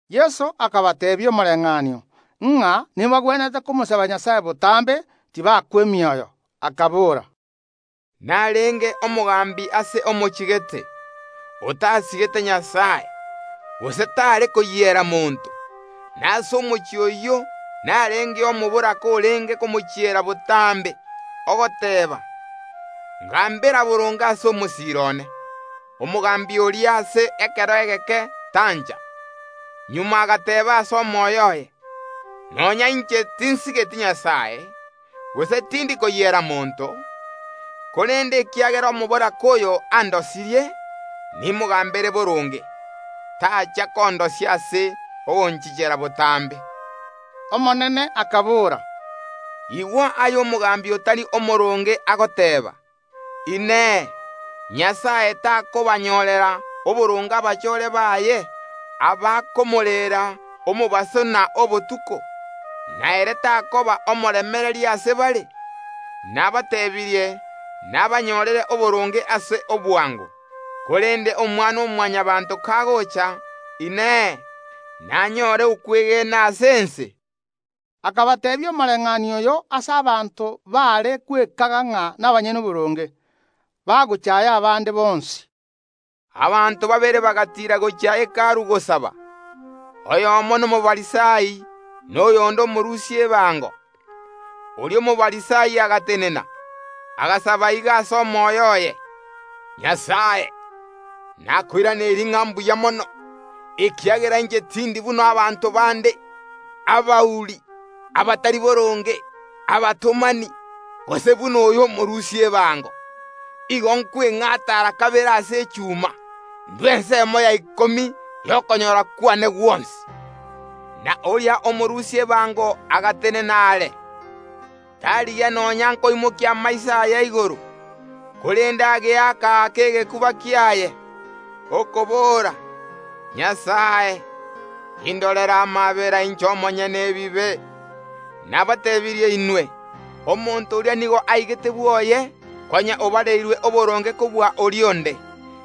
Yeso akabateebia omoreng’anio ng’a nebagwenerete komosaba Nyasae botambe, tibakwa emioyo, akabora, “Narenge omogambi ase omochie gete, otasigete Nyasae, gose taare koyiera monto. Na ase omochie oyio narengeo omoboraka orenge komochiera botambe, ogoteeba: Ngambera boronge ase omosiira one. Omogambi oria ase ekero egeke tancha; magega agateeba ase omoyo oye: Nonya inche tinsigeti Nyasae, gose tindi koyiera monto, korende ekiagera omoboraka oyo andosirie, nimogambere boronge, tacha kondosia ase ogonchichera botambe.” Omonene akabora, “Igwa aya omogambi otari omooronge agoteeba. Inee! Nyasae takobanyorera oboronge abachore baye, abakomoreera omobaso na obotuko? Na ere takoba omoremereria ase bare? Nabatebirie nabanyorere oboronge ase obwango. Korende Omwana‐o‐Mwanyabaanto kagocha, Inee, nanyore okwegena ase ense?” Akabateebia omoreng’anio oyo ase abanto baare gwekaga ng’a nabanyene oboronge, bagochaaya abande bonsi: “Abanto babere bagatiira gochia Hekalu gosaba; oyomo n’Omofarisai na oyonde omorusia ebango. Oria Omofarisai agatenena, agasaba iga ase omoyo oye: Nyasae, nakoiraneirie ng’a mbuya mono, ekiagera inche tindi buna abanto bande, abauri, abatari boronge, abatomani, gose buna oyo omorusia ebango. Igo nkweng’ata ara kabere ase echuma; ’ndua ensemo ya ikomi y’okonyora kwane gwonsi. Na oria omorusia ebango agatenena are, tarigia nonya nkoimokia amaiso aye igoro, korende ageaka‐aka egekuba kiaye, okobora: Nyasae, indorera amaabera inche omonyene ebibe! Nabatebirie inwe: Omonto oria nigo aigete bwoye konya obareirwe oboronge kobua oria onde,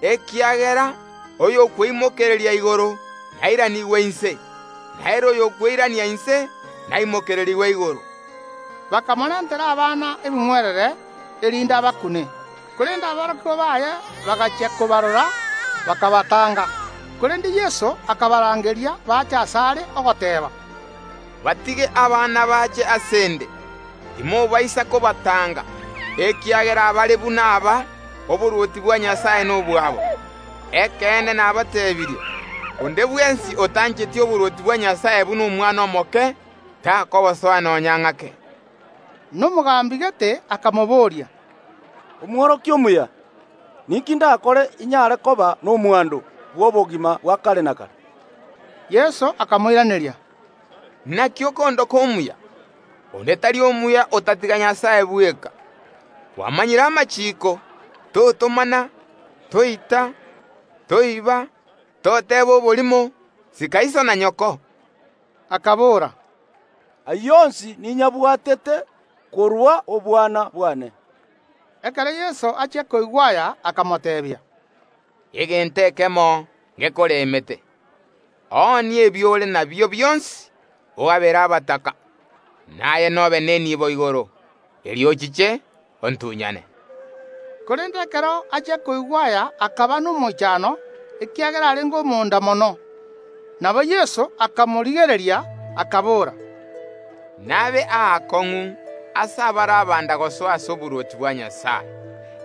ekiagera oyokweimokereria igoro nairanigwe inse, na ere oyokweirania inse naimokererigwe igoro.” Bakamorentera abana ebing’werere, erinde abakune; korende aborokigwa baye bagachia kobarora, bakabatanga. Korende Yeso akabarangeria bache asare, ogoteeba, “Batige abana bache ase ’nde, timobaisa kobatanga, ekiagera abare buna aba, oborwotinbwa Nyasae nobwabo. Ekeene nabateebirie: Onde bwensi otancheti oborwoti bwa Nyasae buna omwana omoke, takobosoa nonya ng’ake.” Na omogambi gete akamobooria, “Omworokia omuya, ninki ndakore inyare koba nomwando bw’obogima bwa kare na kare?” Yeso akamoiraneria, “Naki okondoka omuya? Onde tari omuya otatiga Nyasae bweka. Kwamanyire amachiiko; Totomana, Toita, Toiba, Toteba oborimo, sika iso na nyoko.” Akabora, “Ayio onsi ninyabwatete korwa obwana bwane.” Ekero Yeso achia koigwa aya, akamoteebia, “Egento ekemo ngekoremete; oonie ebio ore nabio bionsi ogabere abataka, na aye nobe nenibo igoro. Erio ochiche ontunyane.” Korende ekero achia koigwa aya akaba nomoichano, ekiagera arenge omonda mono. Nabo Yeso akamorigereria, akabora, “Nabe aakong’u ase abare abanda gosoa ase oborwoti bwa Nyasae!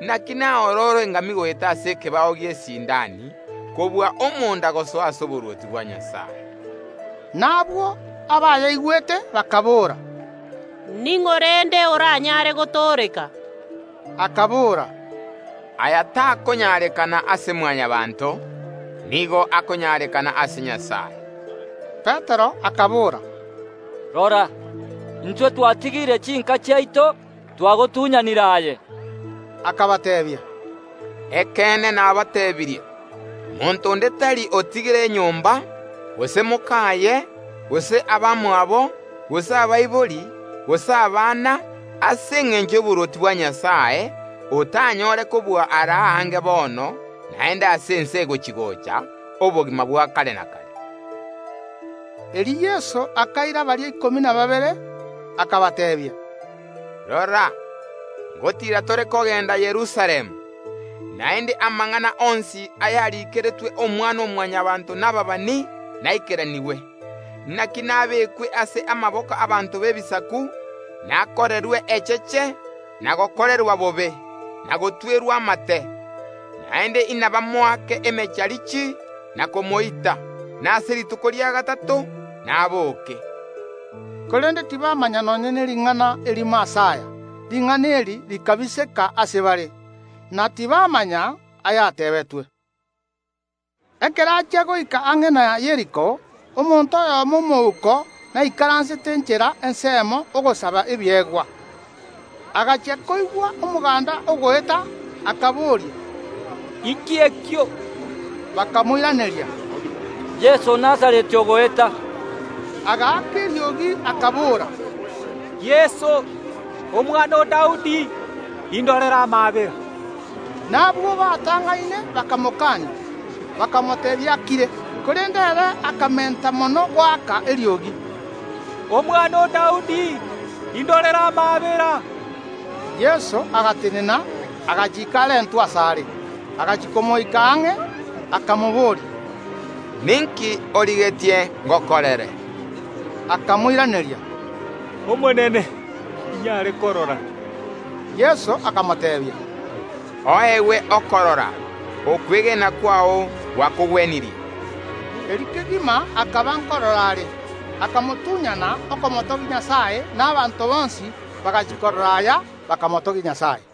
Naki naororo engamia goeta ase ekebao gi’esiindani, kobua omonda gosoa ase oborwoti bwa Nyasae.” Na abwo abayaigwete bakaboora, “Ning’o rende oranyare gotooreka?” Akabora, “Aya takonyarekana ase Mwanyabaanto, nigo akonyarekana ase Nyasae.” Petero akabora, “Rora, intwe twatigire chinka chiaito, twagotunyanire aye.” Akabateebia, “Ekeene nabateebirie: Monto onde tari otigire enyomba, gose mokaye, gose abamwabo, gose abaibori, gose abana, ase engencho y’oborwoti bwa Nyasae, otanyore kobua ara aange bono, naende ase ense egochi‐gocha obogima bwa kare na kare.” Erio Yeso akaira baria ikomi na babere, akabateebia, “Rora, ngotiira tore kogenda Yerusalemu, naende amang’ana onsi ayariikeretwe Omwana‐o‐Mwanyabaanto nababani naikeranigwe. Naki nabekwe ase amaboko y’abanto b’Ebisaku, nakorerwe echeche, na gokorerwa bobe, na gotwerwa amate; naende inabamoake emecharichi na komoita, na ase rituko ria gatato naboke.” Korende tibamanya nonya nering’ana erimo ase aya. Ring’ana eri rikabiseka ase bare, na tibamanya ayateebetwe. Ekero achia goika ang’e na Yeriko omonto oyomo omouko naikaransete enchera ensemo ogosaba ebiegwa. Agachia koigwa omoganda ogoeta, akaboria, “Inki ekio?” Bakamoiraneria, “Yeso o Nazareti ogoeta.” Agaaka eriogi, akabora, “Yeso, omwana o Daudi, indorera amaabera!” Nabwo batang’aine bakamokania, bakamoteebia akire, korende ere akamenta mono goaka eriogi, “Omwana o Daudi, indorera amaabera!” Yeso agatenena, agachiika arentwe asare. Agachia komoika ang’e, akamobooria, “Ninki origetie ngokorere?” Akamoiraneria, “Omonene, inyare korora.” Yeso akamoteebia, “Oegwe okorora; okwegena kwao gwakogwenirie.” Erio kegima akaba nkorora are, akamotunyana, okomotogia Nyasae; na abanto bonsi bagachia korora aya, bakamotogia Nyasae.